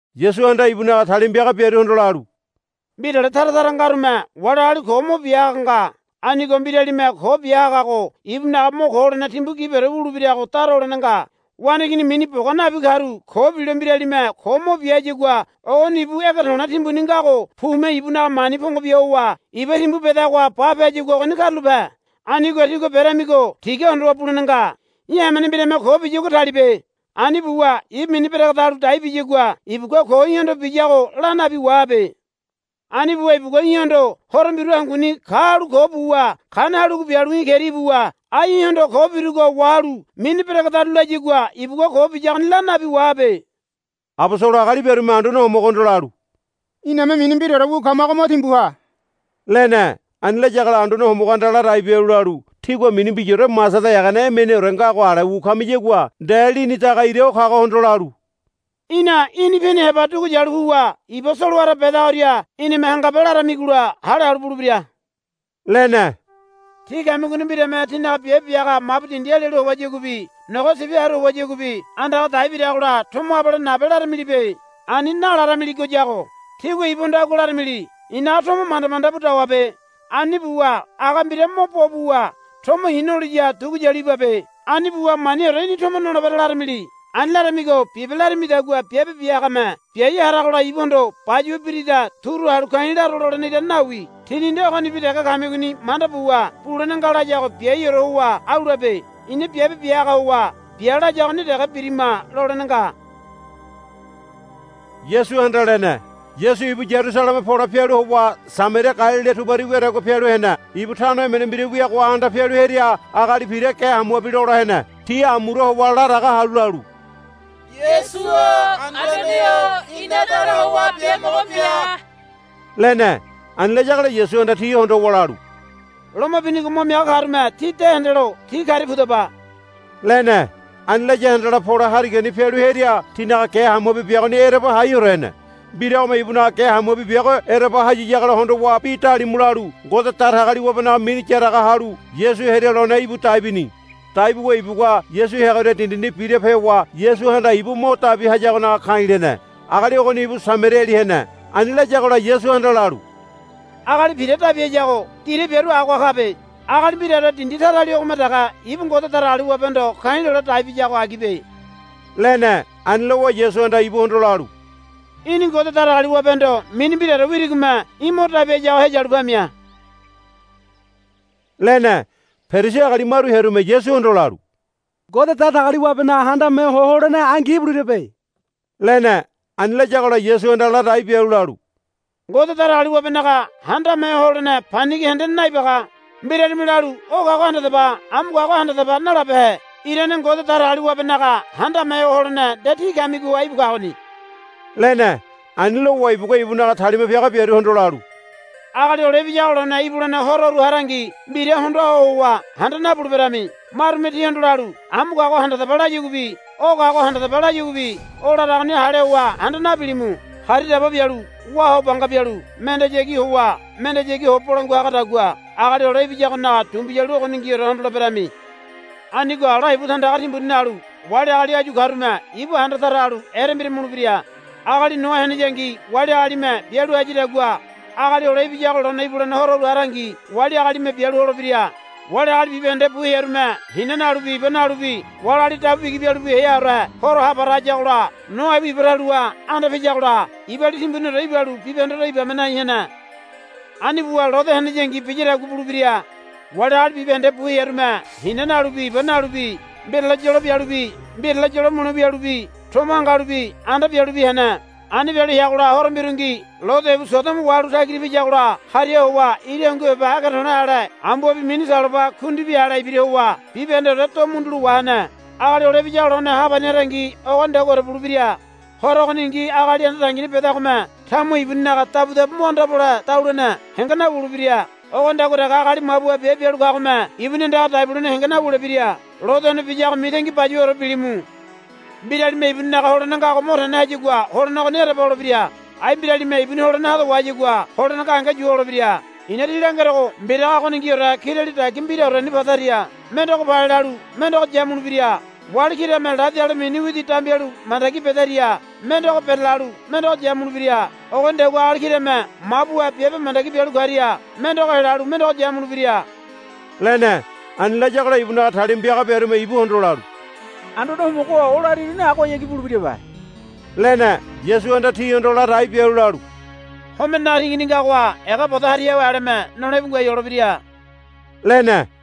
Yasuhanda ibunaga talima piaga biaruhondo lalu, Mbirale tara tara ngarume wali agali ko mo bia haga nga. Anigo mbiralime ko mo bia hagago ibunaga mo ko holene timbu gibiore wulebirago dara holene nga. Waneigini mini boga nabi karu ko bilo mbiralime ko mo bia hayagua ogoni ibu ege to̱le̱ timbuni ngago pume ibunaga mani pongo bia howa iba timbu bedagoha bape hayagua ogoni karulape. Anigo tígua beramigo tiga hondowa bulene nga. Í̠ hamene mbirame ko biyagua talibe. Ani buwa ibu mini beregedalu dai biyagua ibugua ko í̠hondo biyago la nabi wahabe. Ani buwa ibugua í̠hondo horo mbiru hanguni ka halu ko buwa kane halugo bialu í̠ keria ibuwa, Ai í̠hondo ko birugo wahalu mini beregedaru, layagua ibugua ko biyagoni la nabi wahabe. Abosolo agali biarume Anduane Homogohondo lalu, Iname mini mbiraore wu kamago mo timbu ha, lene. Ani layagola Anduane Homogohanda ladai bialu lalu. Tígua mini mbiraore masada egene emeneore ngago ale wu kamiyagua nde lini daga ira o kagohondo lalu, Í̠na í̠ni pini heba dugu yalu puwa iba solowara bedagoria í̠nime hangabe, laramigola hale halu bulebira, lene. Tí kamigoni mbirame tínaga biabe bia haga mabu dindi alialu howayaguabi nogo sibi haru howayaguabi andaga dai biragola, Tomo abale nabe laramilibe. Ani nalaramiligoyago. Tígua ibuhondo agua laramili, I̱naga tomo manda manda bu dawabe. Ani buwa aga mbira mo bo buwa tomo i̱ noliya dugu yalu ibabe. Ani buwa maniore í̠ni tomo nolebere, laramili. Ani laramigo, Bibe, larimidagua biabe bia hagame biai haragola ibuhondo, Bayuwa birida turu halu ka̱i̱ laro, lolene irane nawi. Tíni nde ogonibi dege kamigoni manda buwa, Bulene nga, layago biaiore howa au labe. Ina biabe bia haga howa bia layagoni dege birima lolene nga, Yasuhanda lene. Yasu ibu Yarusaleme pole pialu howa Samaria Galilila tubari wiadagua pialu hene. Ibu tano emene mbira wiagoha anda pialu hearia agali pira ge hamuabi lola hene. Ti amura howa ladaga halu lalu, Yasu-o Anduane-o ina dara howa biamogo bia, lene. Ani layagola Yasuhanda ti hondowa lalu, Loma binigo mo miaga karume tí de hendelo ti karia pudaba, lene. Ani laya handala pole harigani pialu hearia tinaga ge hamuabi biagoni ereba haiore hene. Mbiragome ibunaga ge hamuabi biago ereba hayiyagola hondowa bi dalimu lalu Ngode Datagaliwabenaga mini yaraga halu Yasu hearia lone íbu dai bini. Dai buwa ibugua Yasu heagoria dindini birape howa Yasuhanda ibu mo dabi hayagonaga ka̱i̱ lene. Agali ogoni ibu Samariali hene. Ani layagola Yasuhanda lalu, Agali pira dabi hayago dira biaru agoha kabe. Agali mbiraore dindi tarali ogome dege ibu Ngode Datagaliwabehondo ka̱i̱ lole dai biyago agibe, lene. Ani lowa Yasuhanda ibuhondo lalu, Í̠ni Ngode Datagaliwabehondo mini mbiraore wirigome í̠ mo dabi hayago heyalu pamia, lene. Perisi agali maru hearume Yasuhondo lalu, Ngode Datagaliwabenaga Handame Ho Holene angi ibulebirabe, lene. Ani layagola Yasuhanda ladai bialu lalu, Ngode Datagaliwabenaga Handame Ho Holene panigi hendene naibaga. Mbiralime lalu, O kago handadaba amu kago handadaba, nalabehe. Irane Ngode Datagaliwabenaga Handame Ho Holene nde tí kamigoha íbu kagoni, lene. Ani lowa ibugua ibunaga talima piaga biaruhondo lalu, Agali Hole Ibiyago lone ibulene hororu harangi mbira hondoa ho howa handa nabuleberami. Marume tíhondo lalu, Amu kago handadaba, layaguabi, O kago handadaba, layaguabi o laragoni hale howa handa nabilimu. Hari daba bialu wá ho banga bialu mendehayagi howa mendehayagi ho bolangua hagadagua Agali Hole Ibiyagonaga dumbiyalu ogoningiore hondoleberami. Anigo ala ibu tandaga timbuni nalu wali agali áyu karume ibu handa tara halu erembira mulebira. Agali Noa heneyangi wali agalime bialu hayadagua Agali Hole Ibiyago lone ibulene hororu harangi wali agalime bialu holebira. Wali agali bibahende bu hearume hina nalubi iba nalubi wali agali dabu bigi bialu heaore horo ha para hayagola Noa ibu iba taluha anda piyagola ibali timbuniore ibalu bibahendeore ibame nai hene. Ani buwa Lode heneyangi biyadagua bulebira. Wali agali bibahende bu hearume hina nalubi iba nalubi mbirale yolo bialubi mbirale yolo mule wialubi tomo hangalubi anda bialubi hene. Ani bialu heagola horo mbirungi Lode ibu Sodomo wahalu tagira piyagola hariha howa ira hungu heba ege to̱le̱ ale ambuabi mini saloba kundibi alebi ibira howa bibahendeore do mundulo wa helene. Agali Hole Ibiyago lone ha pani harangi ogonidaguaore bulebira. Horo ogoningi agali anda dangini bedagome tamuha ibuninaga dabudabu mo anda pole daluene henge nawulebira. Ogonidagua dege agali mabuha mabu biabe bialu kagome ibuni andaga dai bulene henge nawulebira. Lode one biyago mitangi bayuwaore bilimu. Mbiralime ibuninaga holene ngago mo tene hayagua holene ogoni ereba holebira. Ai mbiralime ibuni holene hado wahayagua holene gahenge yu holebira. I̱na tí langerogo mbiraga ogoniorengi kirali dagia mbiraoreni padaria mendego palelalu mendego yamulebira. Wali kirame ladi ale mini widi dambialu mandagi bedaria mendego berelalu mendego yamulebira. [ Ogonidagua agali kirame mabuha biabe mandagi bialu karia mendego helalu mendego yamulebira,] lene. Ani layagola ibunaga talima piaga biarume ibuhondo lalu, Anduane Homogo-o o lariruni agohayagi bulebirabe, lene. Yasuhanda tihondo ladai bialu lalu, Homenenaga tingini ngagoha ega bodo hariawe aleme nole íbu ngoai holebira, lene.